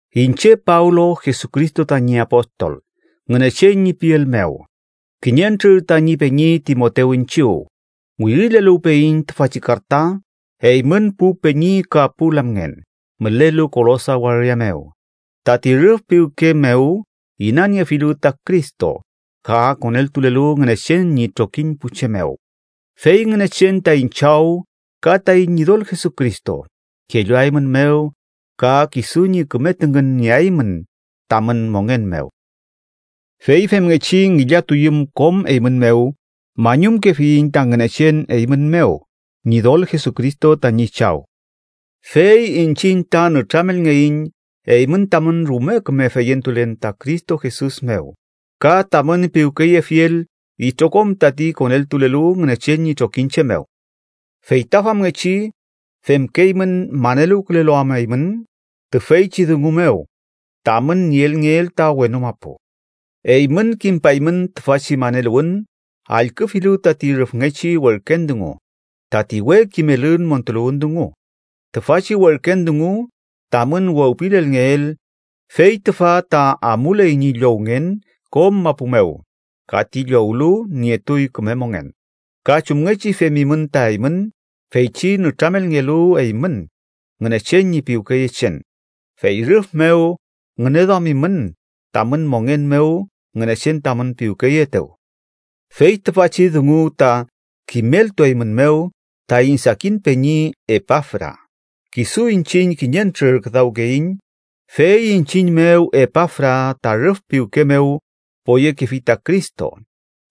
Iñche Pablo, Jesucristo tañi apostol Ngünechen ñi piel mew, kiñentrür tañi peñi Timotew iñchiw, wirileluwpeyiñ tüfachi karta eymün pu peñi ka pu lamngen mülelu Kolosa waria mew tati rüf piwke mew inaniefilu ta Cristo ka koneltulelu Ngünechen ñi trokiñ pu che mew. Fey Ngünechen taiñ Chaw ka taiñ Ñidol Jesucristo kelluaeymünmew ka kisu ñi küme tüngün nieaymün tamün mongen mew. Fey femngechi ngillatuyüm kom eymün mew, mañumkefiyiñ ta Ngünechen eymün mew, Ñidol Jesucristo tañi Chaw. Fey iñchiñ ta nütramelngeiñ eymün tamün rume küme feyentulen ta Cristo Jesus mew ka tamün piwkeyefiel itrokom tati koneltulelu Ngünechen ñi trokiñche mew. Fey ta famngechi femkeymün maneluwkülelu am eymün tüfeychi dungu mew tamün nielngeel ta wenu mapu. Eymün kimpaymün tüfachi maneluwün, allküfilu tati rüfngechi werken dungu, tati we kimelün montuluwün dungu. Tüfachi werken dungu tamün wewpilelngeel fey tüfa ta amuley ñi llowngen kom mapu mew ka ti llowlu nietuy küme mongen, ka chumngechi femimün ta eymün feychi nütramelngelu eymün Ngünechen ñi piwkeyechen, fey rüf mew ngüneduamimün tamün mongen mew Ngünechen tamün piwkeyeetew. Fey tüfachi dungu ta kimeltueymünmew taiñ sakin peñi Epafra. Kisu iñchiñ kiñentrür küdawkeiñ, fey iñchiñ mew Epafra ta rüf piwke mew poyekefi ta Cristo.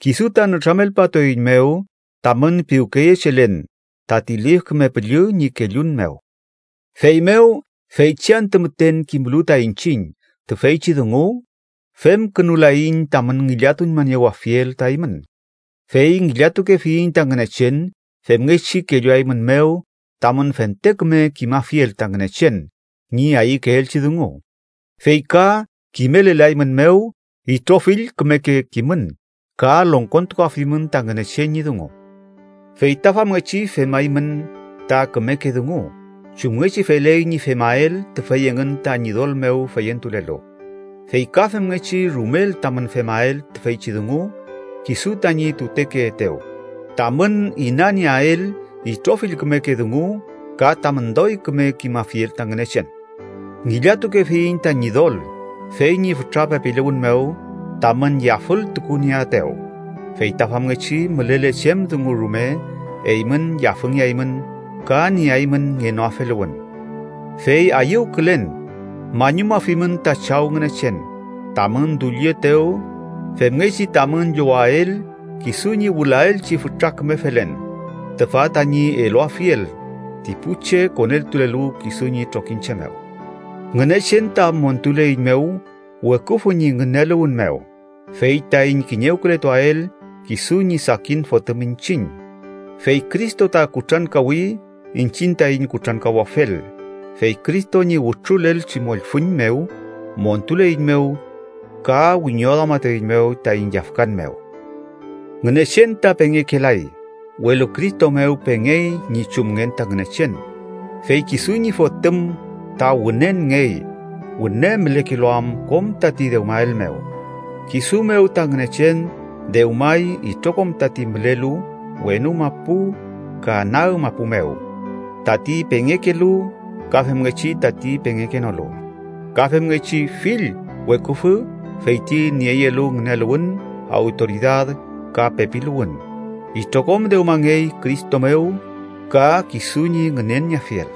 Kisu ta nütramelpatueiñmew tamün piwkeyechelen tati Lif Küme Püllü ñi kellun mew. Feymew feychi antü müten kimlu ta iñchiñ tüfeychi dungu, femkünulaiñ tamün ngillatuñmaniewafiel ta eymün, fey ngillatukefiyiñ ta Ngünechen femngechi kelluaeymünmew tamün fente küme kimafiel ta Ngünechen ñi ayükeelchi dungu fey ka kimelelaeymünmew itrofill kümeke kimün ka longkontukuafimün ta Ngünechen ñi dungu. Fey ta famngechi femaymün ta kümeke dungu chumngechi feley ñi femael tüfey engün ta Ñidol mew feyentulelu, fey ka femngechi rumel tamün femael tüfeychi dungu kisu tañi tutekeetew, tamün inanieael itrofill kümeke dungu ka tamün doy küme kimafiel ta Ngünechen. Ngillatukefiyiñ ta Ñidol, fey ñi fütra pepiluwün mew, tamün yafültukunieaetew. Fey ta famngechi mülele chem dungu rume eymün yafüngeaymün ka nieaymün ngenoafeluwün. Fey ayüwkülen mañumafimün ta Chaw Ngünechen, tamün dullietew femngechi tamün llowael kisu ñi wülaelchi fütra küme felen, tüfa tañi eluafiel ti pu che koneltulelu kisu ñi trokiñche mew. Ngünechen ta montuleiñmew weküfü ñi ngüneluwün mew, fey taiñ kiñewkületuael kisu ñi sakin Fotüm iñchiñ. Fey Cristo ta kutrankawi iñchiñ taiñ kutrankawafel, fey Cristo ñi wütrulelchi mollfüñ mew montuleiñmew ka wiñoduamatueiñmew taiñ yafkan mew. Ngünechen ta pengekelay, welu Cristo mew pengey ñi chumngen ta Ngünechen, fey kisu ñi Fotüm ta wünenngey, wüne mülekelu am kom tati dewmael mew. Kisu mew ta Ngünechen dewmay itrokom tati mülelu wenu mapu ka nag mapu mew, tati pengekelu ka femngechi tati pengekenolu, ka femngechi fill weküfü fey ti nieyelu ngüneluwün, awtoridad ka pepiluwün. Itrokom dewmangey Cristo mew ka kisu ñi ngünenieafiel.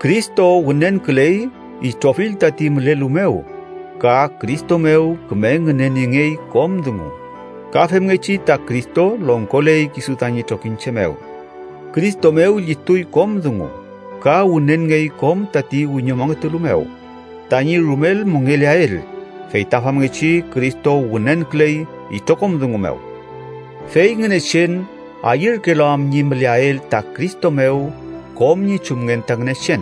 Cristo wünenküley itrofill tati mülelu mew ka Cristo mew küme ngüneniengey kom dungu, ka femngechi ta Cristo longkoley kisu tañi trokiñche mew. Cristo mew llituy kom dungu, ka wünenngey kom tati wiñomongetulu mew tañi rumel mongeleael, fey ta famngechi Cristo wünenküley itrokom dungu mew. Fey Ngünechen ayürkelu am ñi müleael ta Cristo mew kom ñi chumngen ta Ngünechen.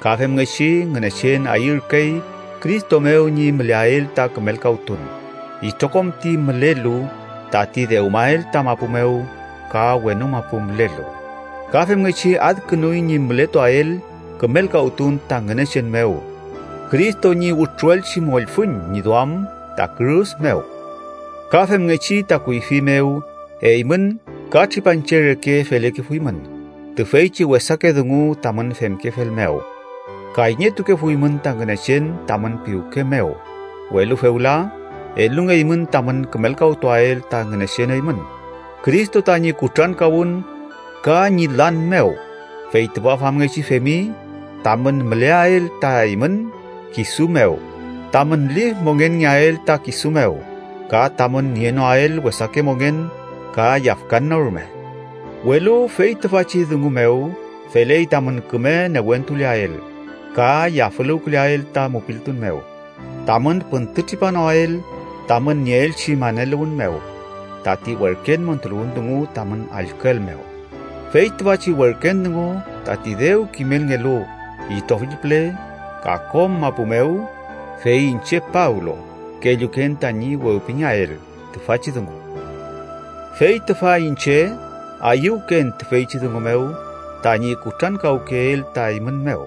Ka femngechi Ngünechen ayürkey Cristo mew ñi müleael ta kümelkawtun itrokom ti mülelu tati dewmael ta mapu mew, ka wenu mapu mülelu, ka femngechi adkünuy ñi mületuael kümelkawtun ta Ngünechen mew Cristo ñi wütruelchi mollfüñ ñi duam ta kürus mew. Ka femngechi ta kuyfi mew eymün ka tripanche reke felekefuymün, tüfeychi wesake dungu tamün femkefel mew, kayñetukefuymün ta Ngünechen tamün piwke mew, welu fewla elungeymün tamün kümelkawtuael ta Ngünechen eymün, Cristo tañi kutrankawün ka ñi lan mew. Fey tüfa famngechi femi tamün müleael ta eymün kisu mew, tamün lif mongenngeael ta kisu mew, ka tamün nienoael wesake mongen ka yafkan no rume, welu fey tüfachi dungu mew feley tamün küme newentuleael ka yafüluwküleael ta mupiltun mew, tamün püntütripanoael tamün nieelchi maneluwün mew, tati werken montuluwün dungu tamün allküel mew. Fey tüfachi werken dungu tati dew kimelngelu itrofill püle ka kom mapu mew, fey iñche Pablo kelluken tañi wewpingeael tüfachi dungu. Fey tüfa iñche ayüwken tüfeychi dungu mew tañi kutrankawkeel ta eymün mew,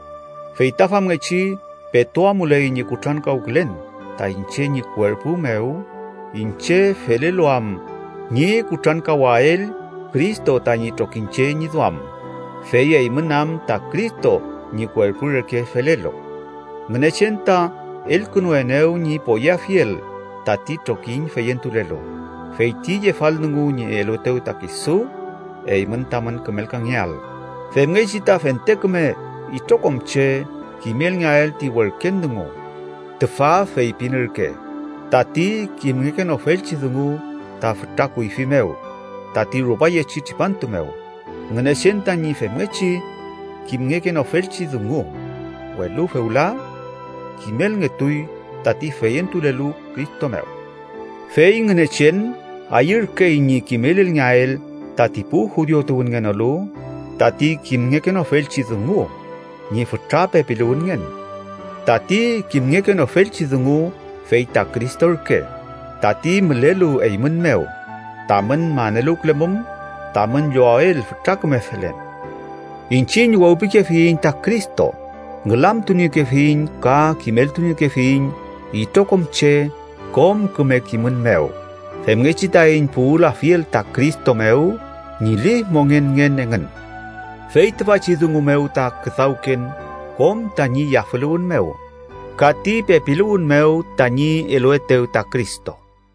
fey ta famngechi petu amuley ñi kutrankawkülen ta iñche ñi kuerpu mew iñche felelu am ñi kutrankawael Cristo tañi trokiñche ñi duam, fey eymün am ta Cristo ñi kuerpu reke felelu. Ngünechen ta elkünuenew ñi poyeafiel tati trokiñ feyentulelu, fey ti yefaldungu ñi eluetew ta kisu, eymün tamün kümelkangeael, femngechi ta fente küme itrokom che kimelngeael ti werken dungu. Tüfa feypin ürke: tati kimngekenofelchi dungu ta fütra kuyfi mew tati rupayechi tripantu mew Ngünechen tañi femngechi kimngekenofelchi dungu, welu fewla kimelngetuy tati feyentulelu Cristo mew. Fey Ngünechen ayürkey ñi kimelelngeael tati pu judiu tuwünngenolu tati kimngekenofelchi dungu ñi fütra pepiluwünngen. Tati kimngekenofelchi dungu fey ta Cristo ürke, tati mülelu eymün mew, tamün maneluwkülemum tamün llowael fütra küme felen. Iñchiñ wewpikefiyiñ ta Cristo, ngülamtuniekefiyiñ ka kimeltuniekefiyiñ itrokom che kom küme kimün mew, femngechi taiñ puwülafiel ta Cristo mew ñi lif mongenngen engün. Fey tüfachi dungu mew ta küdawken kom tañi yafüluwün mew ka ti pepiluwün mew tañi eluetew ta Cristo.